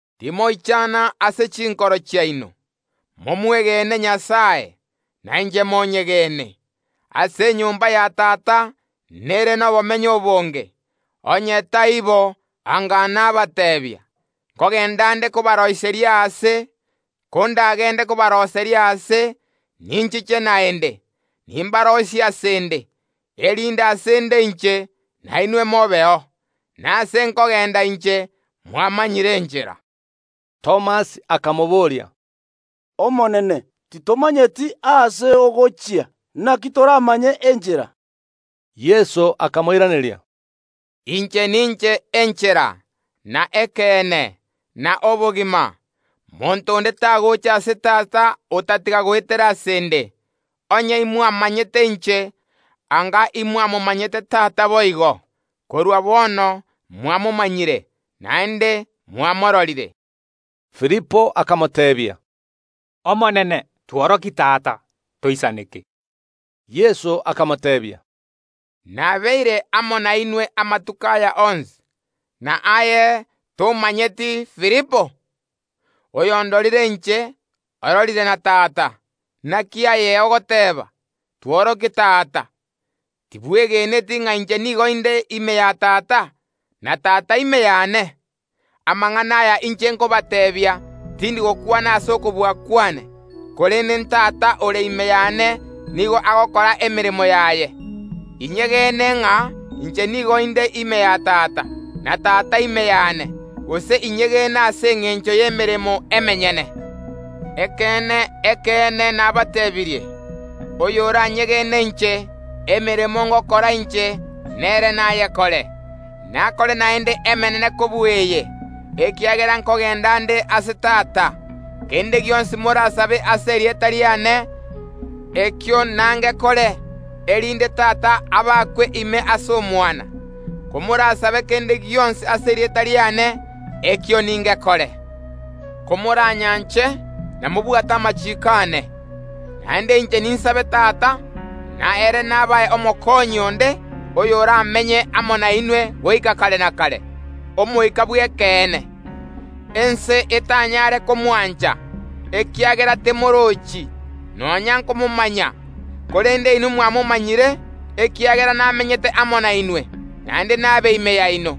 “Timoichana ase chinkoro chiaino; momwegene Nyasae, nainche monyegene. Ase enyomba ya Tata nere nobomenyo obonge; onye taibo, anga nabateebia. Nkogenda nde kobaroiseria aase. Kondagende kobaroiseria aase, ninchiche naende, nimbaroisie ase ’nde, erinde ase ’nde inche, nainwe mobeo. Nase nkogenda inche, mwamanyire enchera.” Thomas akamobooria, “Omonene, titomanyeti aase ogochia, naki toramanye enchera?” Yeso akamoiraneria, “Inche ninche enchera, na ekeene, na obogima; monto onde tagocha ase Tata otatiga goetera ase ’nde. Onye imwamanyete inche, anga imwamomanyete Tata boigo; korwa bono mwamomanyire, naende mwamororire.” Filipo akamoteebia, “Omonene, tworokie Tata, toisaneke.” Yeso akamoteebia, “Nabeire amo nainwe amatuko aya onsi, na aye tomanyeti, Filipo? Oyondorire inche, ororire na Tata; naki aye ogoteeba: Tworokie Tata? Tibwegeneti ng’a inche nigo inde ime ya Tata, na Tata ime yane? Amang’ana aya inche nkobateebia, tindi gokwana ase okobua kwane, korende n’Tata ore ime yane nigo agokora emeremo yaye. Inyegene ng’a inche nigo inde ime ya Tata, na Tata ime yane; gose inyegene ase engencho y’emeremo emenyene. “Ekeene, ekeene, nabateebirie: Oyoranyegene inche, emeremo ngokora inche, nere nayekore; nakore naende emenene kobua eye, ekiagera nkogenda nde ase Tata. Kende gionsi morasabe ase erieta riane, ekio nangekore, erinde Tata abakwe ime ase Omwana. Komorasabe kende gionsi ase erieta riane, ekio ningekore. “Komoranyanche namobwate amachiiko aane. Naende inche ninsambe Tata, na ere nabae Omokonyi onde oyoramenye amo nainwe goika kare na kare, Omoika bw’ekeene. Ense etanyare komwancha, ekiagera temorochi, nonya nkomomanya. Korende inwe mwamomanyire, ekiagera namenyete amo nainwe, naende nabe ime yaino.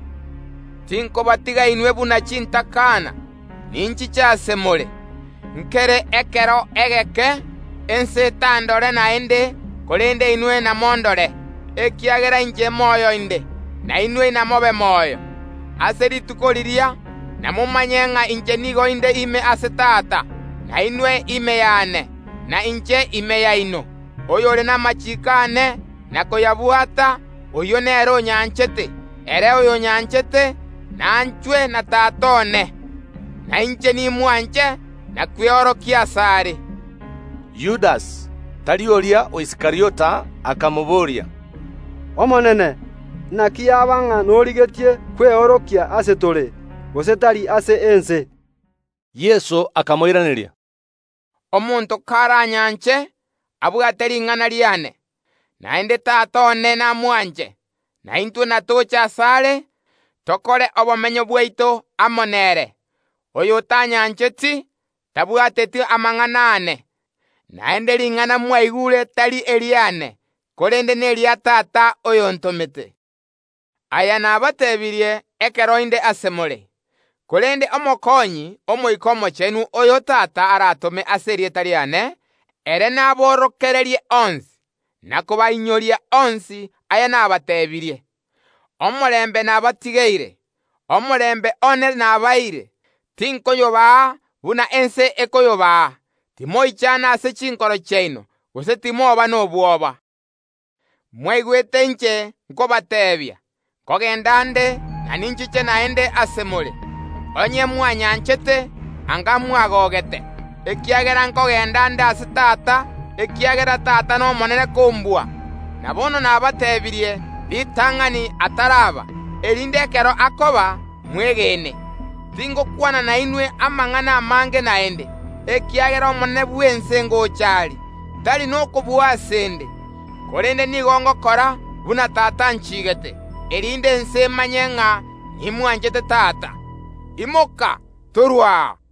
“Tinkobatiga inwe buna chintakana; ninchiche ase more. Nkere ekero egeke, ense etandore naende; korende inwe namondore, ekiagera inche moyo inde, na inwe namobe moyo. Ase rituko riria namomanye ng’a inche nigo inde ime ase Tata, na inwe ime yane, na inche ime yaino. Oyore namachiiko aane, na koyabwata, oyio nere onyanchete; ere oyonyanchete nanchwe na Tata one, na inche nimwanche na kweorokia asare.” Yudasi (tari oria o Iskariota) akamobooria, “Omonene, naki yaba ng’a norigetie kweorokia ase tore, gose tari ase ense?” Yeso akamoiraneria, “Omonto karanyanche, abwate ring’ana riane, naende Tata one namwanche, na intwe natoche asare, tokore obomenyo bwaito amo nere. Oyotanyancheti, tabwateti amang’ana aane; naende ring’ana mwaigure tari eriane, korende neria Tata oyontomete. “Aya nabateebirie ekero inde ase more. Korende Omokonyi, Omoika Omochenu, oyo Tata aratome ase erieta riane, ere naborokererie onsi, na kobainyoria onsi aya nabateebirie. Omorembe nabatigeire; omorembe one nabaeire; tinkoyobaa buna ense ekoyobaa. Timoichana ase chinkoro chiaino, gose timoba nobwoba. Mwaigwete inche nkobateebia: Nkogenda nde, na ninchiche naende ase more. Onye mwanyanchete, anga mwagogete, ekiagera nkogenda nde ase Tata, ekiagera Tata nomonene kombua. Na bono nabateebirie ritang’ani ataraba, erinde ekero akoba, mwegene. Tingokwana nainwe amang’ana amange naende, ekiagera omonene bw’ense ngocha are. Tari nokobua ase ’nde; korende nigo ngokora buna Tata achigeete, erinde ense emanye ng’a nimwanchete Tata. Imoka, torue aa!